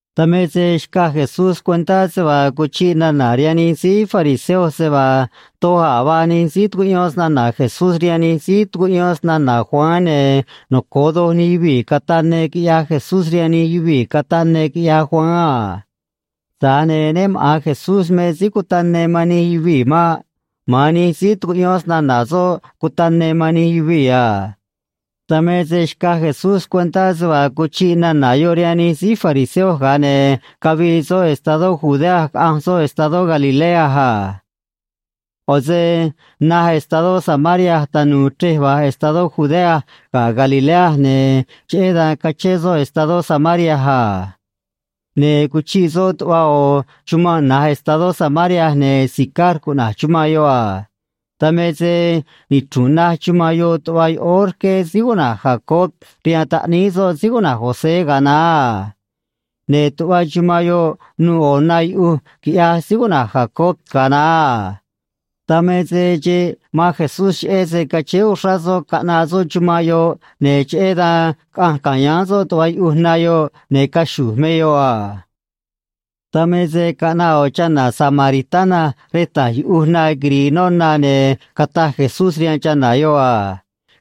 Dan me se xcaj Jesús cuentá se vaa cuchiꞌ nana̱ rihaan nij síí fariseo se vaa doj a̱ vaa nij síí tucuꞌyón snana̱ Jesús rihaan nij síí tucuꞌyón snana̱ Juan, ne̱ noco̱o doj nij yuvii̱ cataꞌ ne quiꞌyaj Jesús rihaan nij yuvii̱ cataꞌ ne quiꞌyaj Juan a. Tza̱j ne̱ né maꞌa̱n Jesús me síí cutaꞌ ne man nij yuvii̱ maꞌ. Ma̱an nij síí tucuꞌyón snana̱ soꞌ cutaꞌ ne man nij yuvii̱ a. Dan me se xcaj Jesús cuentá se vaa cuchiꞌ nana̱ yoꞌ rihaan nij síí fariseo, ga̱a ne̱ cavii soꞌ estadó Judea caꞌanj soꞌ estadó Galilea a. ꞌO̱ se naj estadó Samaria tanu̱u̱ chrej va̱j estadó Judea ga̱ Galilea, ne̱ cheꞌé dan cachén soꞌ estadó Samaria a. Ne̱ cuchiꞌ soꞌ tuꞌva ꞌo̱ chumanꞌ na̱j estadó Samaria, ne̱ Sicar cuꞌna̱j chumanꞌ yoꞌ a. Dan me se nichru̱nꞌ naj chumanꞌ yoꞌ tuꞌva yoꞌóó rqué síí cuꞌna̱j Jacob rihaan taꞌníí soꞌ síí cuꞌna̱j José ga̱a naá a. Ne̱ tuꞌva chumanꞌ yoꞌ nuû ꞌo̱ na yuꞌuj quiꞌyaj síí cuꞌna̱j Jacob ga̱a naá a. Dan me se xeꞌ man Jesús cheꞌé se cachéé uxrá soꞌ caꞌnaꞌ soꞌ chumanꞌ yoꞌ, ne̱ cheꞌé dan caꞌanj ca̱yáán soꞌ tuꞌva yuꞌuj na yoꞌ, ne̱ caxu̱j me yoꞌ a. Dan me se caꞌnaꞌ ꞌo̱ chana̱ samaritana rej ta̱j yuꞌuj na quiri̱i̱ noꞌ na, ne̱ cataj Jesús rihaan chana̱ yoꞌ a: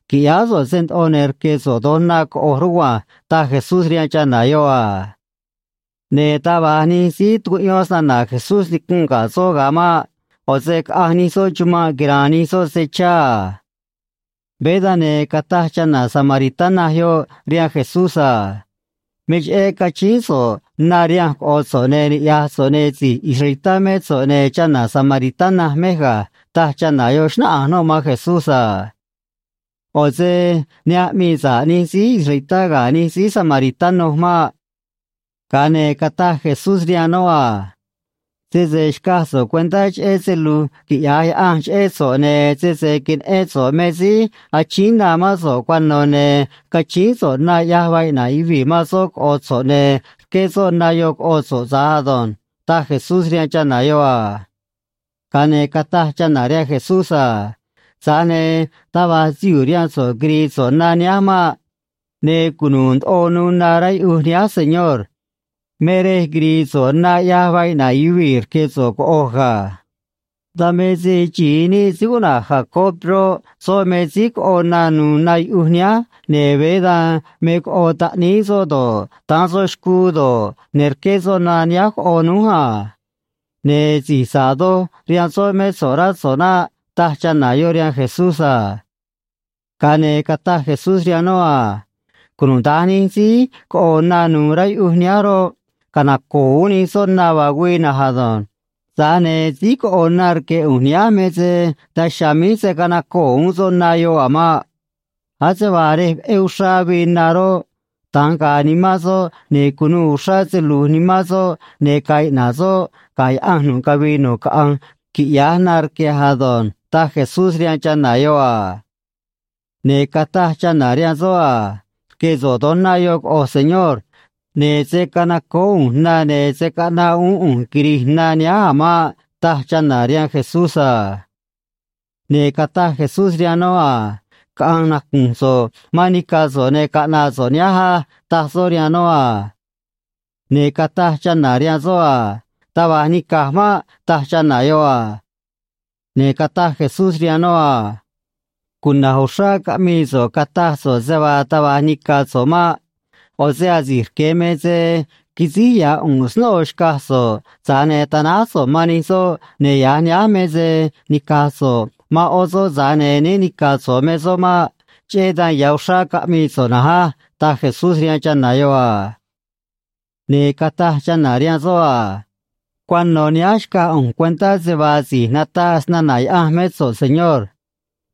―Qui̱ꞌyáá so̱ꞌ se ndoꞌo, ne̱ rque̱ so̱ꞌ do̱j na coꞌo̱j rugua̱nj ―taj Jesús rihaan chana̱ yoꞌ a. Ne̱ taj va̱j nij síí tucuꞌyón snana̱ Jesús nicunꞌ ga̱ soꞌ ga̱a maꞌ. ꞌO̱ se caꞌanj nij soꞌ chumanꞌ quira̱a̱n nij soꞌ se chá a. Veé dan, ne̱ cataj chana̱ samaritana yoꞌ rihaan Jesús a: ―Me cheꞌé cachíín so̱ꞌ na rihanj, coꞌo̱ so̱ꞌ, ne̱ ni̱ꞌyaj so̱ꞌ, ne̱ si̱j israelitá mé so̱ꞌ, ne̱ chana̱ samaritana mej ga̱ ―taj chana̱ yoꞌ, xnáꞌanj noꞌ man Jesús a. ꞌO̱ se ne aꞌmii sa̱ꞌ nij síí israelitá ga̱ nij síí samaritano maꞌ. Ga̱a ne̱ cataj Jesús rihaan noꞌ a: ―Sese xcaj so̱ꞌ cuentá cheꞌé se lu̱j quiꞌya̱j Yaꞌanj cheꞌé so̱ꞌ ne̱ sese queneꞌén so̱ꞌ me síí achíín na mán so̱ꞌ cuano̱, ne̱ cachíín so̱ꞌ na ꞌyaj vaa iꞌna̱ꞌ yuvii̱ man soꞌ coꞌo̱ so̱ꞌ, ne̱ rqué soꞌ na yoꞌ coꞌo so̱ꞌ tza̱j ado̱nj ―taj Jesús rihaan chana̱ yoꞌ a. Ga̱a ne̱ cataj chana̱ rihaan Jesús a: ―Tza̱j ne̱ taj va̱j sihuu̱ rihaan so̱ꞌ quiri̱i̱ so̱ꞌ na nihánj maꞌ. Ne̱ cunu̱u̱ ndoꞌo nuû na rá yuꞌuj nihánj, señor. Me rej quiri̱i̱ so̱ꞌ na ꞌyaj vaa iꞌna̱ꞌ yuvii̱ rque̱ so̱ꞌ coꞌo̱j ga̱. Dan me se xi̱i níꞌ síí cuꞌna̱j Jacob roꞌ, soꞌ me síí coꞌo na nu̱u̱ na yuꞌuj nihánj, ne̱ veé dan me coꞌo taꞌníí soꞌ do̱ꞌ, daán soꞌ xcuu do̱ꞌ, ne̱ rqué soꞌ na nihánj coꞌo̱ núj a. Ne̱ si̱j sa̱ꞌ doj rihaan soꞌ mé so̱ꞌ, rá so̱ꞌ naꞌ ―taj chana̱ yoꞌ rihaan Jesús a. Ga̱a ne̱ cataj Jesús rihaan noꞌ a: ―Cunuda̱nj nij síí coꞌo̱ na nu̱u̱ rá yuꞌuj nihánj roꞌ, canaco̱o̱ uún nij soꞌ na vaa güii na̱nj ado̱nj. Tza̱j ne̱ síí coꞌo̱ na rque̱ ꞌu̱nj nihánj me se daj chiha̱a̱ míj se̱ canacoo̱ uún soꞌ na yoꞌ a̱ maꞌ. Ase vaa rej veꞌé uxrá avii na roꞌ, da̱nj ga̱a̱ nimán soꞌ, ne̱ cu̱nuû uxrá se lu̱j nimán soꞌ, ne̱ ga̱a̱ iꞌna̱ꞌ soꞌ ga̱ Yaꞌanj nu̱ꞌ cavii nu̱ꞌ caꞌanj, quiꞌya̱j na rque̱j ado̱nj ―taj Jesús rihaan chana̱ yoꞌ a. Ne̱ cataj chana̱ rihaan soꞌ a: ―Rque̱ so̱ꞌ do̱j na yoꞌ coꞌo̱j, señor. Ne̱ se̱ canacoó ꞌu̱nj na, ne̱ se̱ caꞌnaꞌ uún ꞌu̱nj quiri̱j na nihánj a̱ maꞌ ―taj chana̱ rihaan Jesús a. Ne̱ cataj Jesús rihaan noꞌ a: ―Caꞌa̱nj nacu̱nj so̱ꞌ man nica̱ so̱ꞌ, ne̱ caꞌna̱ꞌ so̱ꞌ nihánj á ―taj soꞌ rihaan noꞌ a. Ne̱ cataj chana̱ rihaan soꞌ a: ―Taj va̱j nica̱j maꞌ ―taj chana̱ yoꞌ a. Ne̱ cataj Jesús rihaan noꞌ a: ―Cuna̱j uxrá caꞌmii so̱ꞌ, cataj so̱ꞌ se vaa taj va̱j nica̱ so̱ꞌ maꞌ. ꞌO̱ se asi̱j rque̱ me se quisíj ya̱ ꞌu̱nꞌ snóꞌo xcaj so̱ꞌ, tza̱j ne̱ tanáj so̱ꞌ man nij soꞌ, ne̱ ya̱j nihánj me se nica̱j so̱ꞌ man ꞌó soꞌ, tza̱j ne̱ né ni̱ca̱ so̱ꞌ me soꞌ maꞌ. Cheꞌé dan ya̱ uxrá caꞌmii so̱ꞌ na̱nj á ―taj Jesús rihaan chana̱ yoꞌ a. Ne̱ cataj chana̱ rihaan soꞌ a: ―Cuano̱ nihánj xcaj ꞌu̱nj cuentá se vaa si̱j nataꞌ snana̱ Yaꞌanj mé so̱ꞌ, señor.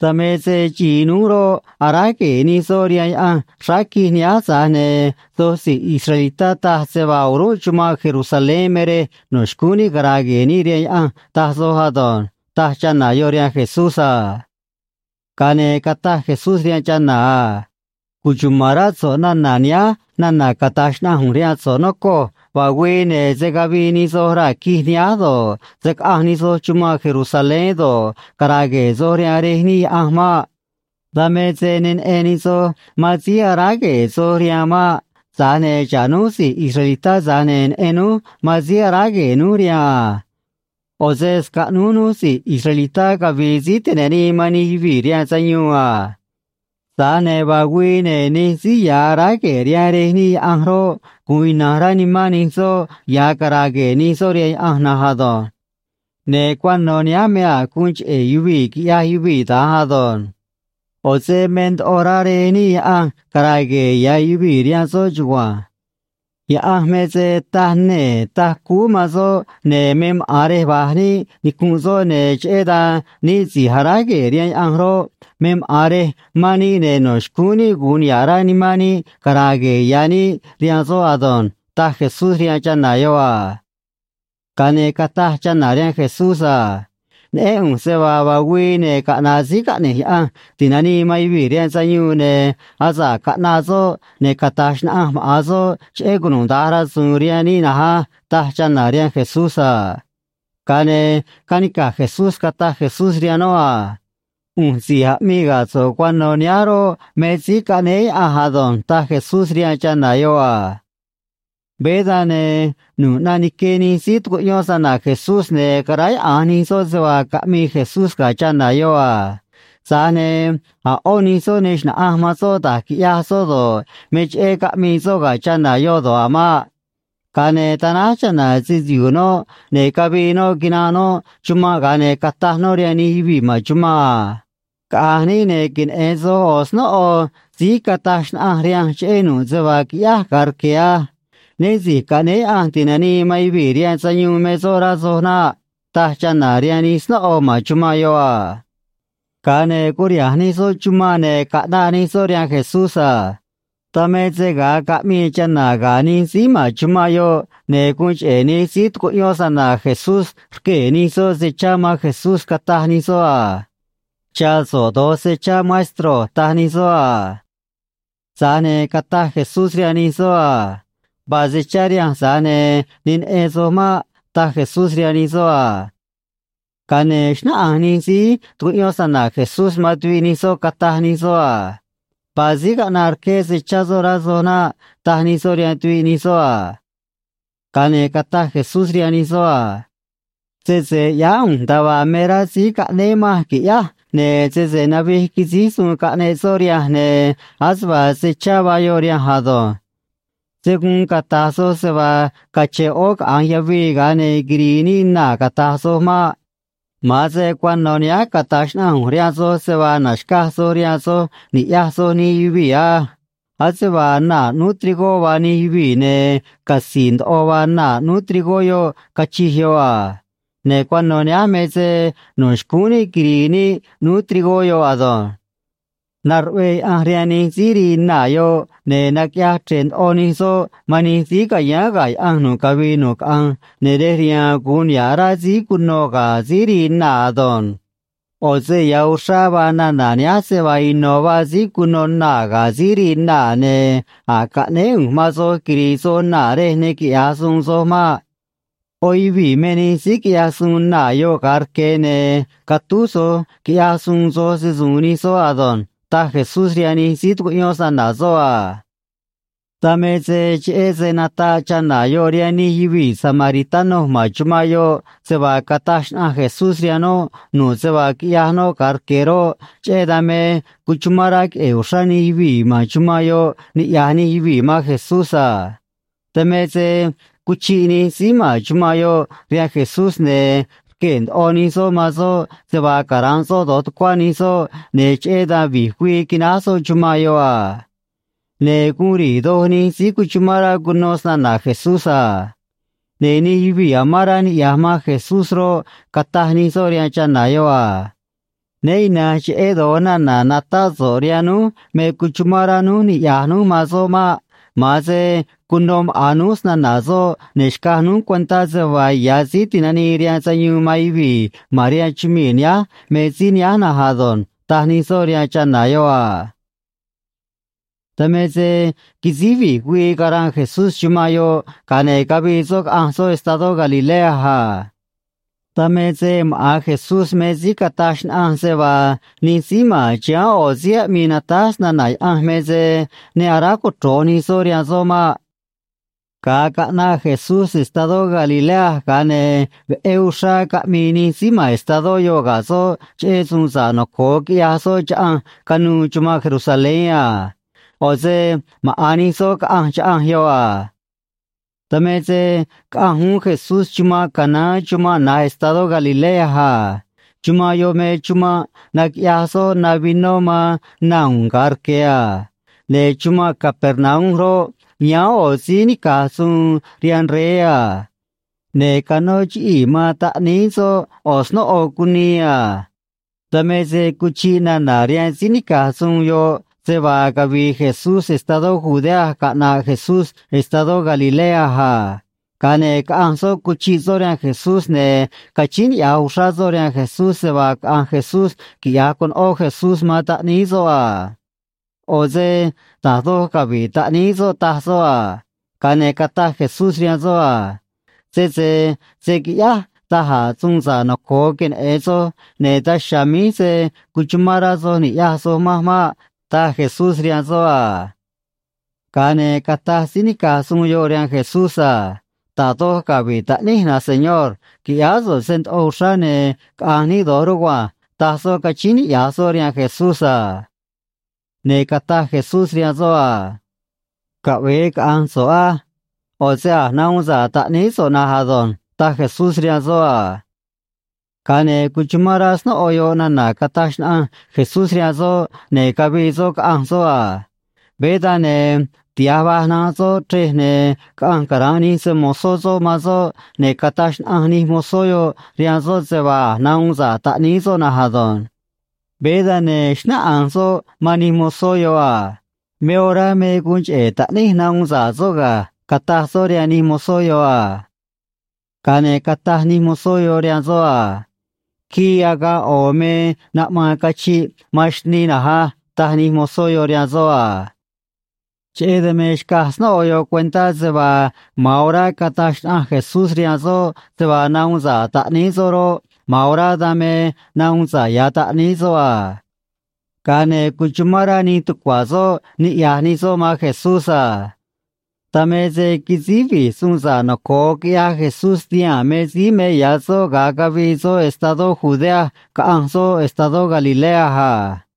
Dan me se xi̱i núj roꞌ, aráj gue̱e̱ nij soꞌ rihaan Yaꞌanj xráá quij nihánj, tza̱j ne̱ soj si̱j israelitá taj se vaa o̱rúnꞌ chumanꞌ Jerusalén me rej no̱ xcúún níꞌ cara̱a̱ gue̱e̱ níꞌ rihaan Yaꞌanj, taj soj ado̱nj ―taj chana̱ yoꞌ rihaan Jesús a. Ga̱a ne̱ cataj Jesús rihaan chana̱ a: ―Cuchuma̱n rá so̱ꞌ nana̱ nihánj nana̱ cata̱j xnaꞌanj ꞌu̱nj rihaan so̱ꞌ, nocoj. Vaa güii, ne̱ se̱ cavii nij soj raa̱ quij nihánj do̱ꞌ, se̱ caꞌanj nij soj chumanꞌ Jerusalén do̱ꞌ, cara̱a̱ gue̱e̱ soj rihaan Rej níꞌ Yaꞌanj maꞌ. Dan me se ne neꞌen nij soj man síí aráj gue̱e̱ soj rihaan maꞌ. Tza̱j ne̱ xa̱ꞌ núj si̱j israelitá, tza̱j ne̱ neꞌen núj man síí aráj gue̱e̱ núj rihaan a. ꞌO̱ se scaꞌnúj núj si̱j israelitá cavi̱i̱ síí ti̱nanii man nij yuvii̱ rihaan sayuun a. Tza̱j ne̱ vaa güii, ne̱ nij síí ya̱ aráj gue̱e̱ rihaan Rej níꞌ Yaꞌanj roꞌ, gu̱un ina̱nj rá nimán nij soꞌ ya̱ cara̱a̱ gue̱e̱ nij soꞌ rihaan Yaꞌanj na̱nj ado̱nj. Ne̱ cuano̱ nihánj me a̱j guun cheꞌe̱ yuvii̱ quiꞌyaj yuvii̱ da̱nj ado̱nj. ꞌO̱ se me ndoꞌo rá Rej níꞌ Yaꞌanj cara̱a̱ gue̱e̱ ya̱ yuvii̱ rihaan soꞌ chugua̱nj. Yaꞌanj me se taj nee̱ taj cúú man soꞌ, ne̱ me maꞌa̱n rej va̱j níꞌ nicunꞌ soꞌ, ne̱ cheꞌé dan níꞌ si̱j aráj gue̱e̱ rihaan Yaꞌanj roꞌ, me maꞌa̱n rej mán níꞌ, ne̱ no̱ xcúún níꞌ gu̱un niha̱ꞌ rá nimán níꞌ cara̱a̱ gue̱e̱ ya̱ níꞌ rihaan soꞌ ado̱nj ―taj Jesús rihaan chana̱ yoꞌ a. Ga̱a ne̱ cataj chana̱ rihaan Jesús a: ―Neꞌén ꞌu̱nj se vaa vaa güii, ne̱ caꞌna̱ꞌ Síí Caꞌne̱j Yaꞌanj Ti̱nanii man Yuvii̱ rihaan Sayuun, ne̱ asa̱ꞌ caꞌnaꞌ soꞌ, ne̱ cata̱j xnaꞌanj maꞌa̱n soꞌ cheꞌé cunuda̱nj rasu̱u̱n rihaan níꞌ na̱nj á ―taj chana̱ rihaan Jesús a. Ga̱a ne̱ canica̱j Jesús cataj Jesús rihaan noꞌ a: ―ꞌU̱nj si̱j aꞌmii ga̱ so̱ꞌ cuano̱ nihánj roꞌ, me Síí Caꞌnéé Yaꞌanj ado̱nj ―taj Jesús rihaan chana̱ yoꞌ a. Veé dan, ne̱ nu̱ꞌ ꞌnaꞌ nique nij síí tucuꞌyón snana̱ Jesús, ne̱ caráyaꞌa̱nj nij soꞌ se vaa caꞌmii Jesús ga̱ chana̱ yoꞌ a. Tza̱j ne̱ a̱ ꞌó nij soꞌ ne xna̱ꞌanj man soꞌ da̱j quiꞌyaj soꞌ do̱ꞌ, me cheꞌé caꞌmii soꞌ ga̱ chana̱ yoꞌ do̱ꞌ a̱ maꞌ. Ga̱a ne̱ tanáj chana̱ se‑sihu̱u̱ noꞌ, ne̱ cavii noꞌ quinanꞌ noꞌ chumanꞌ, ga̱a ne̱ cataj noꞌ rihaan nij yuvii̱ ma̱n chumanꞌ a: ―Caꞌa̱nj níꞌ, ne̱ queneꞌe̱n soj ꞌo̱ snóꞌo síí cataj xnaꞌanj rihanj cheꞌé nu̱ꞌ se vaa quiꞌyáj ga̱a rque̱ á. Né Si̱j Caꞌnéé Yaꞌanj Ti̱nanii man Yuvii̱ rihaan Sayuun me soꞌ, rá soj naꞌ ―taj chana̱ rihaan nij snóꞌo ma̱n chumanꞌ yoꞌ a. Ga̱a ne̱ curiha̱nj nij soꞌ chumanꞌ, ne̱ caꞌnaꞌ nij soꞌ rihaan Jesús a. Dan me se ga̱a caꞌmii chana̱ ga̱ nij síí ma̱n chumanꞌ yoꞌ, ne̱ guun cheꞌe̱ nij síí tucuꞌyón snana̱ Jesús rquee̱ nij soꞌ se chá man Jesús, cataj nij soꞌ a: ―Cha̱ so̱ꞌ do̱j se chá, maestro ―taj nij soꞌ a. Tza̱j ne̱ cataj Jesús rihaan nij soꞌ a: ―Vaa se chá rihanj, tza̱j ne̱ ne neꞌen soj maꞌ ―taj Jesús rihaan nij soꞌ a. Ga̱a ne̱ xnáꞌanj nij síí tucuꞌyón snana̱ Jesús man tuviꞌ nij soꞌ, cataj nij soꞌ a: ―Vaa síí caꞌnaꞌ rqué se chá soꞌ, rá soj naꞌ ―taj nij soꞌ rihaan tuviꞌ nij soꞌ a. Ga̱a ne̱ cataj Jesús rihaan nij soꞌ a: ―Sese ꞌyáá ꞌu̱nj nda̱a vaa me rá síí caꞌnéé manj qui̱ꞌyáj, ne̱ sese navij quisíj suun caꞌneꞌ soꞌ rihanj, ne̱ ase vaa se chá vaa yoꞌ rihanj ado̱nj. Se̱ guun cata̱j soj se vaa cache̱n ꞌó caꞌa̱nj yavii, ga̱a ne̱ quiri̱i̱ níꞌ naa̱, cata̱j soj maꞌ. Ma̱an se cuano̱ nihánj cata̱j xnaꞌanj ꞌu̱nj rihaan soj se vaa na̱xcaj soj rihaan soj, ni̱ꞌyaj soj nij yuvii̱ á. Ase vaa naa̱ ꞌnúú trigó vaa nij yuvii̱, ne̱ catzi̱i̱ ndoꞌo vaa naa̱ ꞌnúú trigó yoꞌ, cachij yoꞌ a. Ne̱ cuano̱ nihánj me se no̱ xcúún níꞌ quiri̱i̱ níꞌ ꞌnúú trigó yoꞌ ado̱nj. Naruꞌvee Yaꞌanj rihaan nij síí rii naa̱ yoꞌ, ne̱ naquiꞌyaj chre̱ꞌ ndoꞌo nij soꞌ man nij síí ca̱yáán ga̱ Yaꞌanj nu̱ꞌ cavii nu̱ꞌ caꞌanj, ne̱ rej riha̱a̱n gu̱un niha̱ꞌ rá síí cunô ga̱ síí rii naa̱ ado̱nj. ꞌO̱ se ya̱ uxrá vaa nana̱ nihánj se vaa ino̱ vaa síí cunô naa̱ ga̱ síí rii naa̱, ne̱ a̱j caꞌnéé ꞌu̱nj man soj quiri̱i̱ soj naa̱ rej ne quiꞌya̱j suun soj maꞌ. ꞌÓ yuvii̱ me nij síí quiꞌyaj suun naa̱ yoꞌ ga̱a rque̱, ne̱ catúj soj quiꞌyaj suun soj se‑su̱u̱n nij soꞌ ado̱nj ―taj Jesús rihaan nij síí tucuꞌyón snana̱ soꞌ a. Dan me se cheꞌé se nataꞌ chana̱ yoꞌ rihaan nij yuvii̱ samaritano ma̱n chumanꞌ yoꞌ se vaa cataj xnaꞌanj Jesús rihaan noꞌ nu̱ꞌ se vaa quiꞌyaj noꞌ ga̱a rque̱ roꞌ, cheꞌé dan me cuchumán rá queꞌe̱e̱ uxrá nij yuvii̱ ma̱n chumanꞌ yoꞌ niꞌya̱j nij yuvii̱ man Jesús a. Dan me se cuchiꞌ nij síí ma̱n chumanꞌ yoꞌ rihaan Jesús, ne̱ rquee̱ ndoꞌo nij soꞌ man soꞌ se vaa cara̱nꞌ soꞌ do̱j tucuá nij soꞌ, ne̱ cheꞌé dan vi̱j güii quináj soꞌ chumanꞌ yoꞌ a. Ne̱ guun ri̱i̱ doj nij síí cuchumán rá cuno snana̱ Jesús a. Ne̱ nij yuvii̱ amán rá niꞌya̱j man Jesús roꞌ, cataj nij soꞌ rihaan chana̱ yoꞌ a: ―Né ina̱nj cheꞌé do̱j nana̱ natáꞌ so̱ꞌ rihaan núj me cuchumán rá núj niꞌya̱j núj man soꞌ maꞌ. Ma̱an se cuno maꞌa̱n núj snana̱ soꞌ, ne̱ xcaj núj cuentá se vaa ya̱ Síí Ti̱nanii rihaan Sayuun man Yuvii̱ ma̱n rihaan chumii̱ nihánj me síí nihánj na̱nj ado̱nj ―taj nij soꞌ rihaan chana̱ yoꞌ a. Dan me se quisíj vi̱j güii caranꞌ Jesús chumanꞌ yoꞌ, ga̱a ne̱ cavii soꞌ caꞌanj soꞌ estadó Galilea a. Dan me se maꞌa̱n Jesús me síí cataj xnaꞌanj se vaa nij síí ma̱n chiháán ꞌo̱ síí aꞌmii natáj snana̱ Yaꞌanj me se ne aráj cochro̱j nij soꞌ rihaan soꞌ maꞌ. Ga̱a caꞌnaꞌ Jesús estadó Galilea, ga̱a ne̱ veꞌé uxrá caꞌmii nij síí ma̱n estadó yoꞌ ga̱ soꞌ cheꞌé suun sa̱ꞌ noco̱o quiꞌyaj soꞌ chaꞌanj canuû chumanꞌ Jerusalén a. ꞌO̱ se maꞌa̱n nij soꞌ caꞌanj chaꞌanj yoꞌ a. Dan me se caꞌanj uún Jesús chumanꞌ Caná chumanꞌ na̱j estadó Galilea a. Chumanꞌ yoꞌ me chumanꞌ naquiꞌyaj soꞌ na vinó man na u̱u̱n ga̱a rque̱ a. Ne̱ chumanꞌ Capernaum roꞌ, yáán ꞌo̱ síí nica̱j suun rihaan rey a. Ne̱ canó chiꞌii̱ man taꞌníí soꞌ ꞌo̱ snóꞌo cunii a. Dan me se cuchiꞌ nana̱ rihaan síí nica̱j suun yoꞌ se vaa cavii Jesús estadó Judea caꞌnaꞌ Jesús estadó Galilea a. Ga̱a ne̱ caꞌanj soꞌ cuchiꞌ soꞌ rihaan Jesús, ne̱ cachíín niꞌya̱j uxrá soꞌ rihaan Jesús se vaa caꞌa̱nj Jesús quiꞌya̱j conoꞌó Jesús man taꞌníí soꞌ a. ꞌO̱ se da̱j doj cavi̱ꞌ taꞌníí soꞌ, taj soꞌ a. Ga̱a ne̱ cataj Jesús rihaan soꞌ a: ―Sese se̱ quiꞌyáj da̱j a̱ suun sa̱ꞌ noco̱o queneꞌe̱n soj, ne̱ daj chiha̱a̱ míj se̱ cuchumán rá soj ni̱ꞌyaj soj manj maꞌ ―taj Jesús rihaan soꞌ a. Ga̱a ne̱ cataj síí nica̱j suun yoꞌ rihaan Jesús a: ―Da̱j doj cavi̱ꞌ taꞌníj, na̱nj señor. Qui̱ꞌyáá so̱ꞌ se ndoꞌo uxrá, ne̱ caꞌa̱nj níꞌ do̱j rugua̱nj ―taj soꞌ, cachíín niꞌya̱j soꞌ rihaan Jesús a. Ne̱ cataj Jesús rihaan soꞌ a: ―Caꞌve̱e caꞌa̱nj so̱ꞌ á. ꞌO̱ se a̱j nahuun sa̱ꞌ taꞌníí so̱ꞌ na̱nj ado̱nj ―taj Jesús rihaan soꞌ a. Ga̱a ne̱ cuchumán rá snóꞌo yoꞌ nana̱ cataj xnaꞌanj Jesús rihaan soꞌ, ne̱ cavii soꞌ caꞌanj soꞌ a. Veé dan, ne̱ tiha̱j va̱j nanꞌ soꞌ chrej, ne̱ caꞌanj cara̱nꞌ nij se‑mo̱zó soꞌ man soꞌ, ne̱ cataj xnaꞌanj nij mozó yoꞌ rihaan soꞌ se vaa a̱j nahuun sa̱ꞌ taꞌníí soꞌ na̱nj ado̱nj. Veé dan, ne̱ xnáꞌanj soꞌ man nij mozó yoꞌ a: ―Me orá me guun cheꞌe̱ taꞌníj nahuun sa̱ꞌ soꞌ ga̱ ―cataj soꞌ rihaan nij mozó yoꞌ a. Ga̱a ne̱ cataj nij mozó yoꞌ rihaan soꞌ a: ―Quii agaꞌ ꞌo̱ me naꞌmaân cachiꞌ man xnii na̱nj á ―taj nij mozó yoꞌ rihaan soꞌ a. Cheꞌé dan me xcaj snóꞌo yoꞌ cuentá se vaa ma̱an orá cataj xnaꞌanj Jesús rihaan soꞌ se vaa nahuun sa̱ꞌ taꞌníí soꞌ roꞌ, ma̱an orá dan me nahuun sa̱ꞌ ya̱ taꞌníí soꞌ a. Ga̱a ne̱ cuchumán rá nij tucua̱ soꞌ niꞌya̱j nij soꞌ man Jesús a. Dan me se quisíj vi̱j suun sa̱ꞌ noco̱o quiꞌyaj Jesús tihaa̱n me síí me ya̱ soꞌ ga̱a cavii soꞌ estadó Judea caꞌanj soꞌ estadó Galilea a.